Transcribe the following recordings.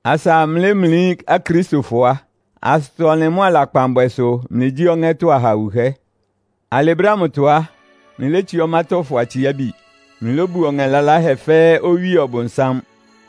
Asa mlɩlémlí Akristofɔ á, asʋtɔ-ɔnlɩn mʋ́a lakpanbwɛ sʋ mlɩgyí ɔŋɛ́tɔ́ aha wuhɛ́. Alɩ brɛ́ ámʋtɔ á, mlɩlétsiá ɔmátɔ́fɔ atsiábi. Mlɩlóbuo ɔŋɛ laláhɛ fɛ́ɛ́ owíe Ɔbʋnsám.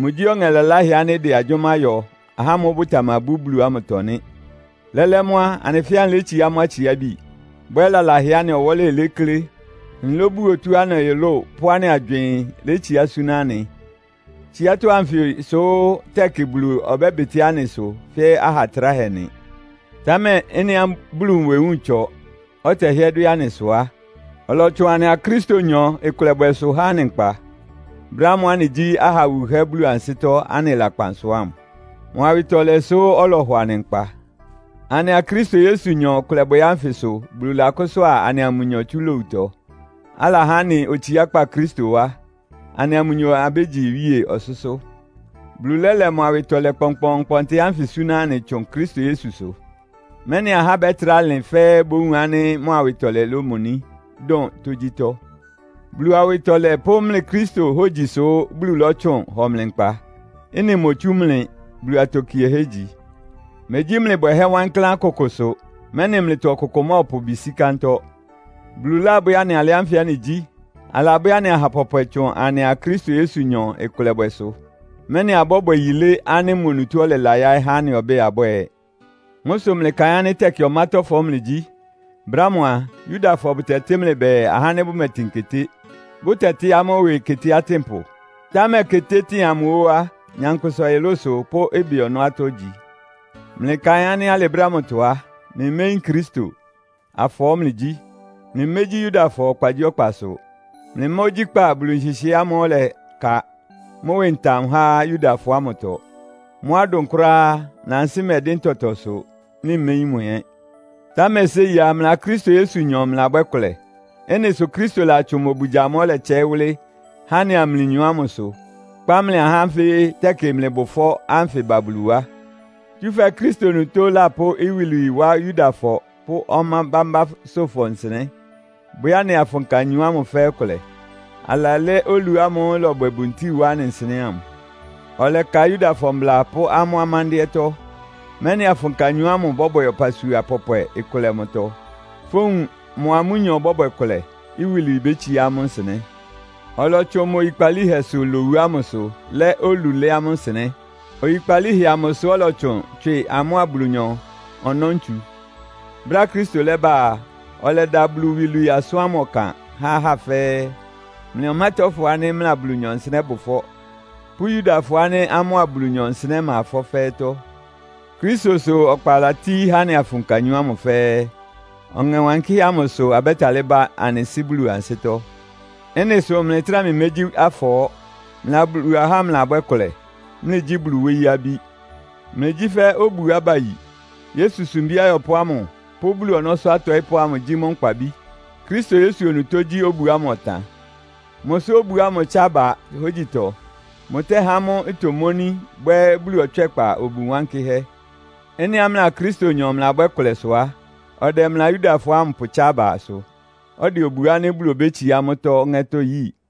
Mʋgyí ɔŋɛ laláhɛ ánɩ́ ɩdɛ agyʋ́má yɔ ahá ámʋ́ʋ́ bʋtamabú Bulu ámʋtɔ nɩ́. Lɛ́lɛ́ mʋ́ á, anɩ fɛ́ɛ́ anɩlétsiá amʋ́ atsiábi, bwɛ́ lalahɛá anɩ ɔwɔ́lɩ léklé. Anɩlóbuo tɔ́á anɩ ɔyʋlʋ́ʋ pʋ́ anɩ agywɩɩn létsiá súná anɩ. Tsiátɔ́ anfɩ sʋ́ tɛkɩ Bulu ɔbɛ́bɩtɩ́ anɩ ɩsʋ fɛ́ aha atráhɛ nɩ. Támɛ ɩ́nɩá Bulu nwewúun ɩtsɔ, ɔtɛhɩ́ɛ́ dwɛ́ anɩ sʋ á, ɔlɔtsʋn anɩa Kristonyɔ ɩkʋlɛbwɛsʋ há anɩ nkpa, brɛ́ ámʋ́ʋ́ anɩgyí aha wuhɛ́ Bulu ansɩ́tɔ́ anɩ lakpan sʋ ámʋ. Mʋ awɩtɔlɛ sʋ́ ɔlɔhɔ anɩ nkpa. Anɩa Kristo Yesunyɔ ɩkʋlɛbwɛ ánfɩ sʋ Bulu lakʋ́sʋ́a anɩa mʋnyɔ tsú lowutɔ, alahá anɩ otsiákpá Kristo wá. Anɩa mʋnyɔ abégyi iwíe ɔsʋ́sʋ́. Bulu lɛ́lɛ mʋ awɩtɔlɛ kpɔnkpɔɔnkpɔntɩ ánfɩ súná anɩ tsʋn Kristo Yesusʋ, mɛ́nɩ ahá ánɩ́ bɛ́trá lɩn fɛ́ɛ́ bówun ánɩ́ mʋ awɩtɔlɛ lomoní dʋn tógyítɔ́. Bulu awɩtɔlɛ pʋ́ mlɩ Kristo hógyisʋ Bulu lɔ́tsʋn hɔ mlɩ nkpa. Ɩ́nɩ motsú mlɩ, Bulu atokiehɛ́ igyi. Megyí mlɩ bwɛhɛ́ wankláán kʋkʋ sʋ, mɛ́nɩ mlɩtɔ ɔkʋkʋ mɔ́ɔpʋ ɩbɩ sí kántɔ́. Bulu lábwɛ́ anɩ alɩ ánfɩ anɩgyí. Alabwɛ́ anɩ aha pɔpwɛ tsʋn anɩa Kristo Yesunyɔ ɩkʋlɛbwɛsʋ, mɛ́nɩ abɔ́bwɛ yilé ánɩ́ mʋ onutó ɔlɛla yáɩ́ há anɩ ɔbɛ́ɛ abwɛ́ɛ. Mʋ́ sʋ mlɩkaɩn ánɩ́ tɛkɩ ɔmátɔ́fɔ mlɩgyí. Brɛ́ ámʋ a, Yudafɔ bʋtɛtɩ́ mlɩ bɛɛ, “Ahá ánɩ́ bʋmɛtɩn keté,” bʋ́tɛtɩ́ amʋ́ ɩwɩ keté atɩ́npʋ. (Támɛ ketétɩ́ɩn amʋ ó á, nyankpʋsa ɔyʋlʋ́sʋ pʋ́ ɩbɩ ɔnɔ́ atɔ́ igyi.) Mlɩkaɩn ánɩ́ alɩ brɛ́ ámʋtɔ á, mlɩméyín Kristo. Afɔɔ́ mlɩgyí. Mlɩmégyí Yudafɔ ɔkpagyíɔkpasʋ. Mlɩmá ogyíkpá Bulu nhɩhɩɛ́ ámʋ́ʋ́ ɔlɛka mʋ́ ɩwɩ ntam há Yudafɔ ámʋtɔ. Mʋ́á ɩdʋn kʋ́ráá á, mlɩ ansɩ́ mɛdɩ́n tɔtɔsʋ, mlɩméyín mʋ ɛ́. Támɛ séi á, mlɩa Kristo Yesunyɔ mlɩlabwɛ́ kʋlɛ. Ɩ́nɩ sʋ Kristo latsʋn mʋ obugya amʋ́ʋ́ ɔlɛtsɛɩ́ wʋ́lɩ́ há anɩa mlɩnyɔ ámʋsʋ, kpá mlɩ ahá ánfɩ tɛkɩ mlɩbʋ ɩfɔ́ ánfɩ ba Bulu wá. Tsúfɛ́ Kristo onutó lapʋ́ iwilwii wá Yudafɔ pʋ́ ɔmá bámbásʋ́fɔ nsɩnɛ́, bwɛ́ anɩ afʋnka anyɔ ámʋ fɛ́ɛ́ kʋlɛ. Alalɛ́ olu ámʋ́ʋ́ ɩlɔbwɛ buntíi wá anɩ nsɩnɛ́ ámʋ. Ɔlɛka Yudafɔ mbla pʋ́ amʋ́ amándɩ́ɛ́tɔ́, mɛ́nɩ afʋnka anyɔ amʋ́ bɔ́bwɛ ɔpasua pɔpwɛ ɩkʋlɛ mʋtɔ. Fówun mʋa amʋ́nyɔ bɔ́bwɛ kʋlɛ, iwilwii bétsiá amʋ́ nsɩnɛ́. Ɔlɔtsʋn mʋ oyikpalíhɛsʋ lowu ámʋsʋ lɛ́ olu lɛ́ amʋ́ nsɩnɛ́. Oyikpalíhɛ amʋsʋ ɔlɔtsʋn tswɩ amʋ́a Bulunyɔ ɔnɔ́ ntsu. Brɛ́á Kristo lɛ́bá a, ɔlɛda Bulu iwilwii asʋ́n ámʋ ɔkan há ahá fɛ́ɛ́. Mlɩ ɔmátɔ́fɔ ánɩ́ mlɩa Bulunyɔ nsɩnɛ́ bʋ ɩfɔ́ pʋ́ Yudafɔ ánɩ́ amʋ́a Bulunyɔ nsɩnɛ́ ma ɩfɔ́ fɛ́ɛ́tɔ́. Kristo sʋ ɔkpa latíí há anɩ afʋnka anyɔ ámʋ fɛ́ɛ́. Ɔŋɛ Wankɩ́hɛ́ ámʋ sʋ abɛ́talɩ́ ba anɩ Sɩ́ Bulu ansɩ́tɔ́. Ɩ́nɩ sʋ mlɩtráa mlɩmégyí afɔɔ́. Mlɩa Bulu ahá mlɩlabwɛ́ ɩkʋlɛ, mlɩgyí Bulu wóyí abí. Mlɩgyí fɛ́ obuá bayi. Yesu sumbí ayɔpʋ́ ámʋ pʋ́ Bulu ɔnɔ́sʋ́ atɔɩ́pʋ́ amʋ gyí mʋ́ nkpabí. Kristo Yesu onutó gyí obu ámʋ ɔtan. Mʋ sʋ obu ámʋ ɩtsa aba hógyitɔ. Mʋtɛ́há mʋ́ itomóní bwɛ́ Bulu ɔtswɛ́kpa obu wankɩ́hɛ́. Ɩ́nɩá mlɩa Kristonyɔ mlɩlabwɛ́ ɩkʋlɛ sʋ á, ɔdɛ mlɩa Yudafɔ ámʋ pʋtsá abasʋ, ɔdɛ obu ánɩ́ Bulu obétsiá mʋ́tɔ́ ɔŋɛ́tɔ́ yíi.